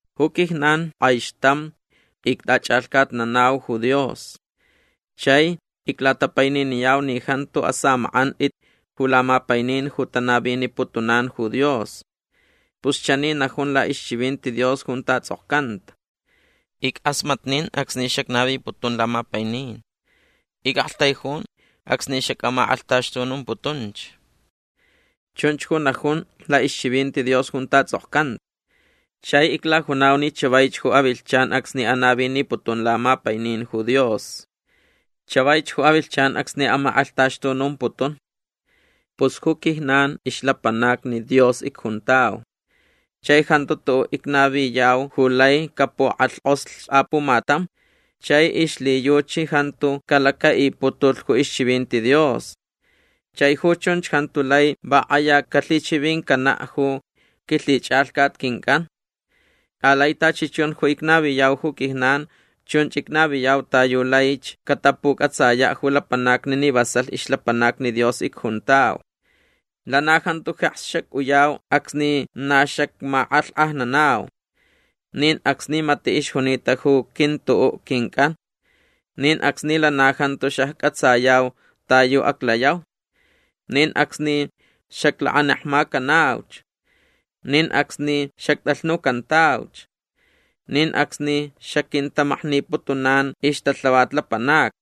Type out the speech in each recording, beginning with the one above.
Ju quijnan k'aixtam ict'ach'alhcatnanau ju Dios. Chai iclatapaininiyau ni jantu asamak'ant'it ju lamapainin ju tanaviniputunan ju Dios. Pus chani najun la'ixchivinti Dios junta ts'okcanta: Ick'asmatnin acsni xacnaviputun lamapainin. Ic'aktaijun acsni xac'amak'alhtaxtunumputunch. Chunch ju najun la'ixchivinti Dios junta ts'okcanta. Chai iclajunau ni chavaich ju avilhchan acsni anaviniputun lamapainin ju Dios. Chavaich ju avilhchan acsni amak'alhtaxtunumputun. Pus ju quijnan ixlapanacni Dios icjuntau. Chai jantu tu'u' icnaviyau ju lai capuk'alhk'oslh apumatam chai ixlhiyuchi jantu calaca'iputulh ju ixchivinti Dios. Chai ju chunch jantu lai va k'aya calhichivincana' ju quilhich'alhcat quinc'an. Alai tachi chun ju icnaviyau ju quijnan chunch icnaviyau ta yu laich catapuc'atsaya' ju lapanacni ni vasalh ixlapanacni Dios icjuntau. Lana jantu jeks xac'uyau acsni na xacmak'alhk'ajnanau. Nin acsni mati' ixjunita ju quintu'u' quinc'an. Nin acsni lana jantu xacc'atsayau ta yu aclayau. Nin acsni xaclakanekmacanauch. Nin acsni xact'alhnucantauch. Nin acsni xaquintamakniputunan ixtalhavat lapanacni.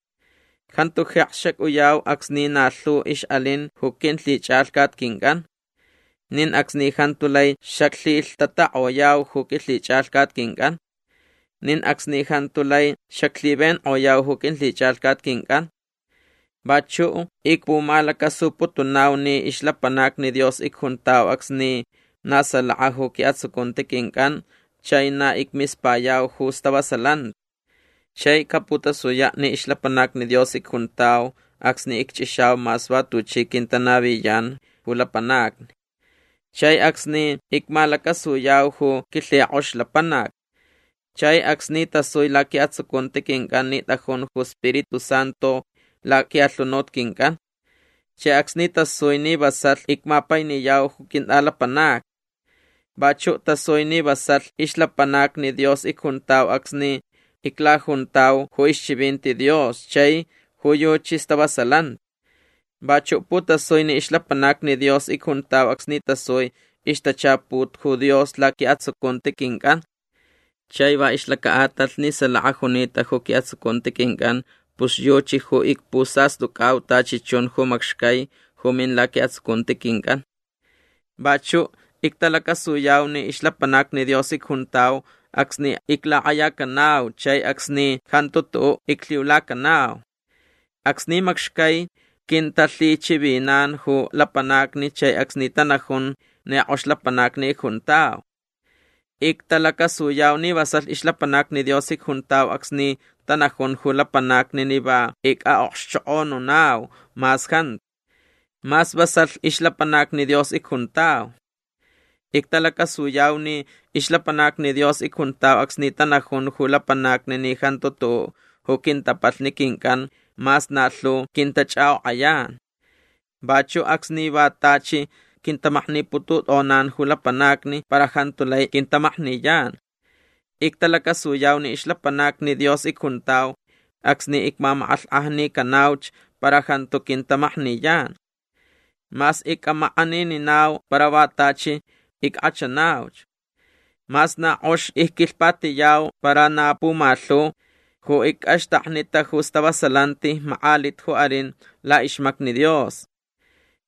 Jantu jeks xac'uyau acsni na lhu ix'alin ju quilhich'alhcat quinc'an. Nin acsni jantu lai xaclhilhtatak'oyau ju quilhich'alhcat quinc'an. Nin acsni jantu lai xaclhivenk'oyau ju quilhich'alhcat quinc'an. Vachu' icpumalacasuputunau ni ixlapanacni Dios icjuntau acsni na salaka ju qui'atsucunti quinc'an chai na icmispayau ju stavasalanti. Chai caputasuya' ni ixlapanacni Dios icjuntau acsni icch'ixau mas va tuchi quintanaviyan ju lapanacni. Chai acsni icmalacasuyau ju quilhik'ox lapanac. Chai acsni tasui laqui'atsucunti quinc'an ni t'ajun ju Spiritu Santu laqui'alhunut quinc'an. Chai acsni tasui ni vasalh icmapainiyau ju quint'alapanacni. Vachu' tasui ni vasalh ixlapanacni Dios icjuntau acsni iclajuntau ju ixchivinti Dios chai ju yuchi stavasalanti. Vachu' putasui ni ixlapanacni Dios icjuntau acsni tasui ixtachaput ju Dios laqui'atsucunti quinc'an. Chai va ixlaca'atalh ni salaka junita ju qui'atsucunti quinc'an pus yuchi ju icpusast'uc'au tachi chun ju macxcai ju min laqui'atsucunti quinc'an. Vachu' ictalacasuyau ni ixlapanacni Dios icjuntau acsni iclak'ayacanau chai acsni jantu tu'u' iclhiulacanau. Acsni macxcai quintalhichivinan ju lapanacni chai acsni tanajun ni k'ox lapanacni icjuntau. Ictalacasuyau ni vasalh ixlapanacni Dios icjuntau acsni tanajun ju lapanacni ni va ic'a'okxchok'onunau mas jantu. Mas vasalh ixlapanacni Dios icjuntau. Ictalacasuyau ni ixlapanacni Dios icjuntau acsni tanajun ju lapanacni ni jantu tu'u' ju quintapalhni quinc'an mas na lhu quintach'ak'ok'ayan. Vachu' acsni va tachi quintamakniputut'onan ju lapanacni para jantu lai quintamakniyan. Ictalacasuyau ni ixlapanacni Dios icjuntau acsni icmamak'alhk'ajnicanauch para jantu quintamakniyan. Mas ic'amak'anininau para va tachi ick'achanauch. Mas na k'ox icquilhpatiyau para na pumalhu ju ic'axtaknita ju stavasalanti mak'alit ju alin la'ixmacni Dios.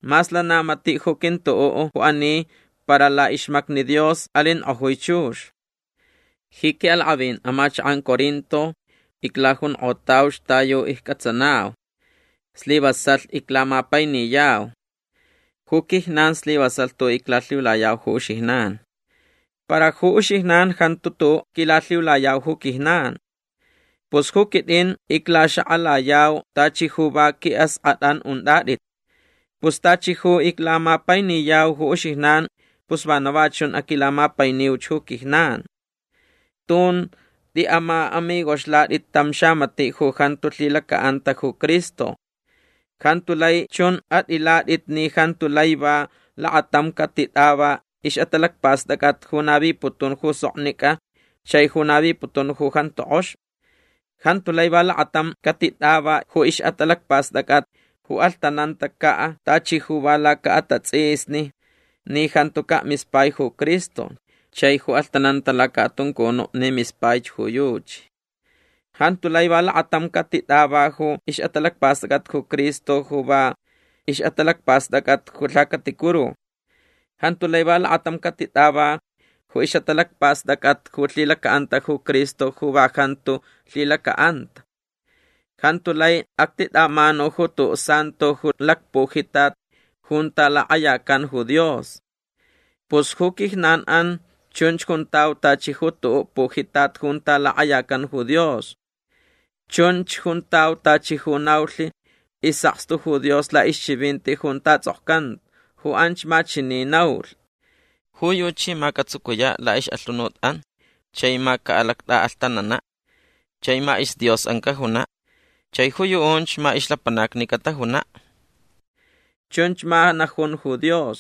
Mas lana mati' ju quintu'u' ju ani para la'ixmacni Dios alink'ojui chux. Ji qui'alak'avin amachak'an Corinto iclajunk'otauch ta yu icc'atsanau. Slivasalh iclamapainiyau. Ju quijnan slivasalh tu'u' iclalhiulayau ju uxijnan. Para ju uxijnan jantu tu'u' quilalhiulayau ju quijnan. Pus ju quit'in iclaxak'alayau tachi ju va qui'ask'at'an unt'at'it. Pus tachi ju iclamapainiyau ju uxijnan pus vana va chun aquilamapainiuch ju quijnan. Tun t'i'ama'amigoxlat'it tam xamati' ju jantu lhilaca'anta ju Cristo. Jantu lai chun at'ilat'it ni jantu lai va lakatam catit'ava ix'atalacpast'ac'at ju naviputun ju soknic'a chai ju naviputun ju jantu k'ox. Jantu lai va lakatam catit'ava ju ix'atalacpast'ac'at ju alhtanantaca' tachi ju va laca'atats'isni ni jantuca' mispai ju Cristo chai ju alhtananta laca'atuncunu' ni mispaich ju yuchi. Jantu lai va lakatam catit'ava ju ix'atalacpast'ac'at ju Cristo ju va ix'atalacpast'ac'at ju lhacaticuru. Jantu lai va lakatam catit'ava ju ix'atalacpast'ac'at ju lhilaca'anta ju Cristo ju va jantu lhilaca'anta. Jantu lai actit'amanu ju tu'u' santo ju lacpujitat junta lak'ayacan ju Dios. Pus ju quijnan'an chunch juntau tachi ju tu'u' pujitat junta lak'ayacan ju Dios. Chunch juntau tachi ju naulh is'akstu ju Dios la'ixchivinti junta ts'okcanta. Ju anch ma chani naulh: Ju yuchi ma catsucuya' la'ix'alhunut'an chai ma ca'alact'a'alhtanana'. Chai ma isDios'an cajuna'. Chai ju yu'unch ma ixlapanacni catajuna'. Chunch ma najun ju Dios.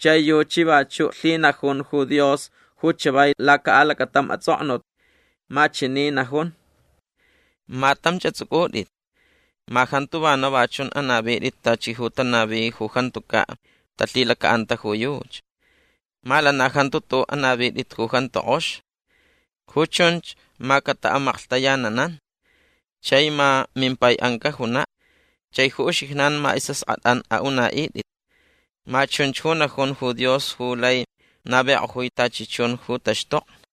Chai yuchi vachu' lhinajun ju Dios ju chavai laca'alacatam ats'oknut. Ma chani najun: Ma tamch ats'uc'ut'it. Ma jantu vana va chun anavit'it tachi ju tanavi ju jantuca' talhilaca'anta ju yuchi. Ma lana jantu tu'u' anavit'it ju jantu k'ox. Ju chunch ma cata'amaklhtayananan. Chai ma mimpai'an cajuna'. Chai ju uxijnan ma is'ask'at'an a'una'it'it. Ma chunch ju najun ju Dios ju lai navik'ojui tachi chun ju taxtokni.